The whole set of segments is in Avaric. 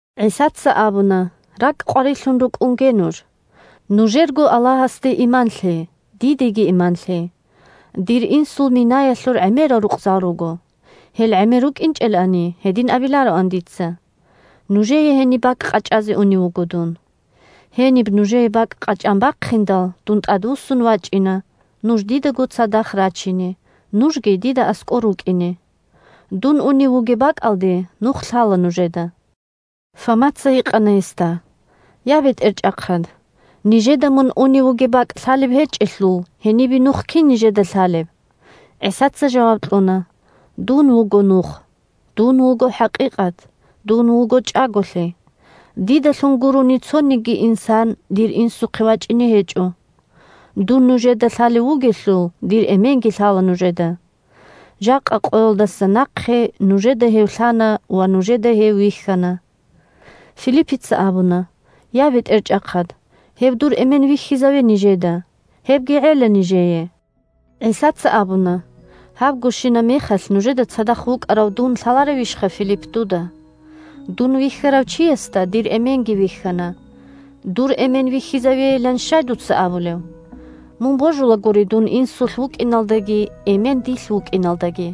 ГӀисаца абуна: – РакӀ къварилъун рукӀунге нуж. Нужерго Аллагьасде иман лъе, дидеги иман лъе. Дир Инсул минаялъур гӀемерал рукъзал руго. Гьел гӀемер рукӀинчӀелани, гьедин абилароан дица. Нужее гьениб бакӀ къачӀазе унев вуго дун. Гьениб нужее бакӀ къачӀан бахъиндал, дун тӀадвуссун вачӀина нуж дидаго цадахъ рачине, нужги дида аскӀор рукӀине. Дун унев вугеб бакӀалде нух лъала нужеда. Фомаца гьикъана гьесда: – Я, БетӀерчӀахъад! Нижеда мун унев вугеб бакӀ лъалеб гьечӀелъул, гьенибе нух кин нижеда лъалеб? ГӀисаца жаваб кьуна: – Дун вуго нух. Дун вуго хӀакъикъат. Дун вуго чӀаголъи. Дидалъун гурони цониги инсан дир Инсухъе вачӀине гьечӀо. Дун нужеда лъалев вугелъул, дир Эменги лъала нужеда. Жакъа къоялдаса нахъе нужеда гьев лъана ва нужеда гьев вихьана. Филиппица абуна: – Я, БетӀерчӀахъад! Гьев дур Эмен вихьизаве нижеда. Гьебги гӀела нижее. ГӀисаца абуна: – Гьабгощинаб мехалъ нужеда цадахъ вукӀарав дун лъаларевищха, Филипп, дуда? Дун вихьарав чиясда дир Эменги вихьана. Дур Эмен вихьизавейилан щай дуца абулеб? Мун божулагури дун Инсулъ вукӀиналдаги, Эмен дилъ вукӀиналдаги.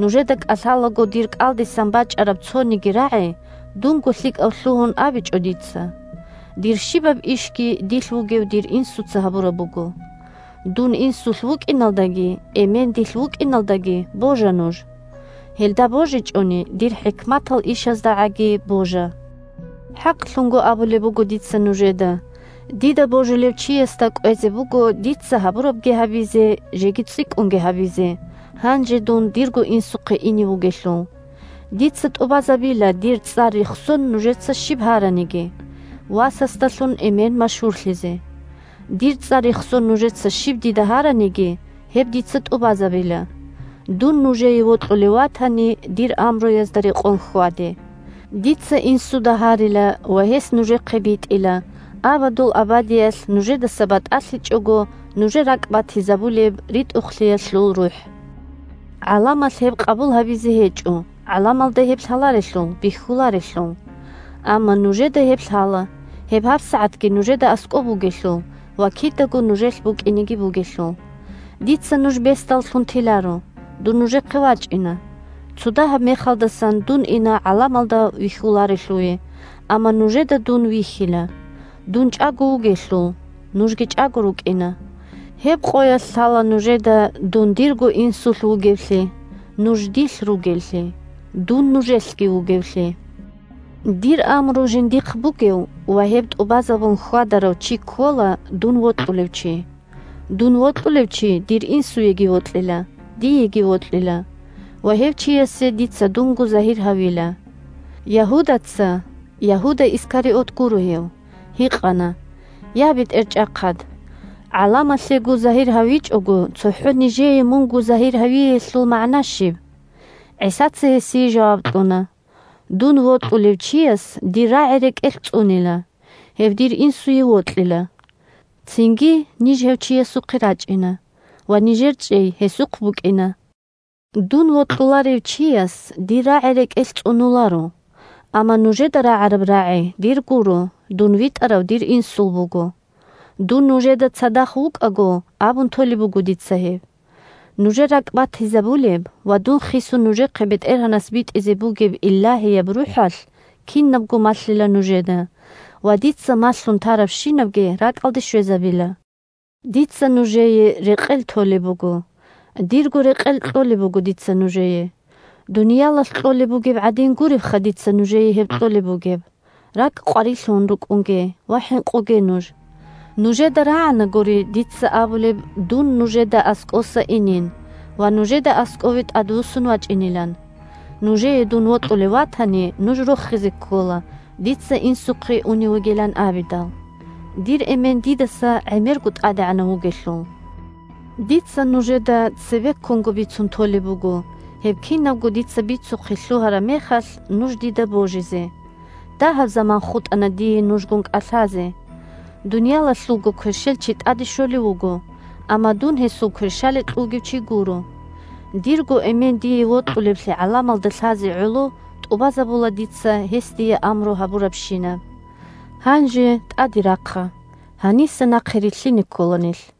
Нужеда кӀалъалаго дир кӀалдисан бачӀараб цониги рагӀи дунго лъикӀав лъугьун абичӀо дица. Дир щибаб ишги дилъ вугев дир Инсуца гьабураб буго. Дун Инсулъ вукӀиналдаги, Эмен дилъ вукӀиналдаги божа нуж. Гьелда божичӀони, дир хӀикматал ишаздагӀаги божа. ХӀакълъун абулеб буго дица нужеда: дида божулев чиясда кӀвезе буго дица гьабурабги гьабизе, жеги цӀикӀкӀунги гьабизе, гьанже дун дирго Инсухъе ине вугелъул. Дица тӀубазабила, дир цӀар рехсон нужеца щиб гьараниги, – Васасдалъун Эмен машгьурлъизе. Дир цӀар рехсон нужеца щиб дида гьараниги, гьеб дица тӀубазабила. Дун нужее вокьулев ватани, дир амруязда рекъон хьваде. Дица Инсуда гьарила ва гьес нужехъе битӀила абадул абадиялъ нужедаса батӀалъичӀого нужер ракӀбатизабулеб РитӀухълъиялъул РухӀ. ГӀаламалъ гьеб къабул гьабизе гьечӀо, гӀаламалда гьеб лъаларелъул, бихьуларелъул. Амма нужеда гьеб лъала, гьеб гьабсагӀатги нужеда аскӀоб бугелъул ва кидаго нужелъ букӀинеги бугелъул. Дица нуж бесдаллъун теларо. Дун нужехъе вачӀина. Цодагьаб мехалдасан дун ина гӀаламалда вихьуларелъуве, амма нужеда дун вихьила. Дун чӀаго вугелъул, нужги чӀаго рукӀина. Гьеб къоялъ лъала нужеда дун дирго Инсулъ вугевлъи, нуж дилъ ругеллъи, дун нужелъги вугевлъи. Дир амру жиндихъ бугев ва гьеб тӀубазабун хьвадарав чи ккола дун вокьулев чи, дун вокьулев чи дир Инсуеги вокьила, диеги вокьила ва гьев чиясе дица дунго загьир гьавила. Ягьудаца (Ягьуда Искариот гуро гьев) гьикъана: – Я, БетӀерчӀахъад, гӀаламалъего загьир гьавичӀого, цохӀо нижее мунго загьир гьавиялъул магӀна щиб? ГӀисаца гьесие жаваб кьуна: – Дун вокьулев чияс дир рагӀи рекӀелъ цӀунила, гьев дир Инсуе вокьила. Цинги ниж гьев чиясухъе рачӀина, ва нижер чӀей гьесухъ букӀина. Дун вокьуларев чияс дир рагӀи рекӀелъ цӀунуларо, амма нужеда рагӀараб рагӀи дир гуро, дун витӀарав дир Инсул буго. Дун нужеда цадахъ вукӀаго абун толеб буго дица гьеб. Нужер ракӀбатизабулеб ва дун хисун нужехъе БетӀергьанас битӀизе бугеб Илагьияб РухӀалъ кинабго малъила нужеда ва дица малъун тарабщинабги ракӀалде щвезабила. Дица нужее рекъел толеб буго, дирго рекъел кьолеб буго дица нужее, дуниялалъ кьолеб бугеб гӀадин гуребха дица нужее гьеб кьолеб бугеб! РакӀ къварилъун рукӀунге ва хӀинкъуге нуж! Нужеда рагӀанагури дица абулеб дун нужеда аскӀоса инин ва нужеда аскӀове тӀадвуссун вачӀинилан. Нужее дун вокьулев ватани, нуж рохизе ккола дица Инсухъе унев вугилан абидал. Дир Эмен дидаса гӀемерго тӀадегӀанав вугелъул! Дица нужеда цебеккунго бицун толеб буго, гьеб кинабго дица бицухъе лъугьараб мехалъ, нуж дида божизе. Дагьаб заман хутӀана дие нужгун кӀалъазе. Дуниялалъулго кверщелчи тӀаде щолев вуго, амма дун гьесул кверщаликь вугев чи гуро. Дирго Эмен дие вокьулевлъи гӀаламалда лъазе гӀоло тӀубазабула дица гьес дие амру гьабурабщинаб. Гьанже тӀаде рахъа, гьаниса нахъе рилълъине ккола нилъ.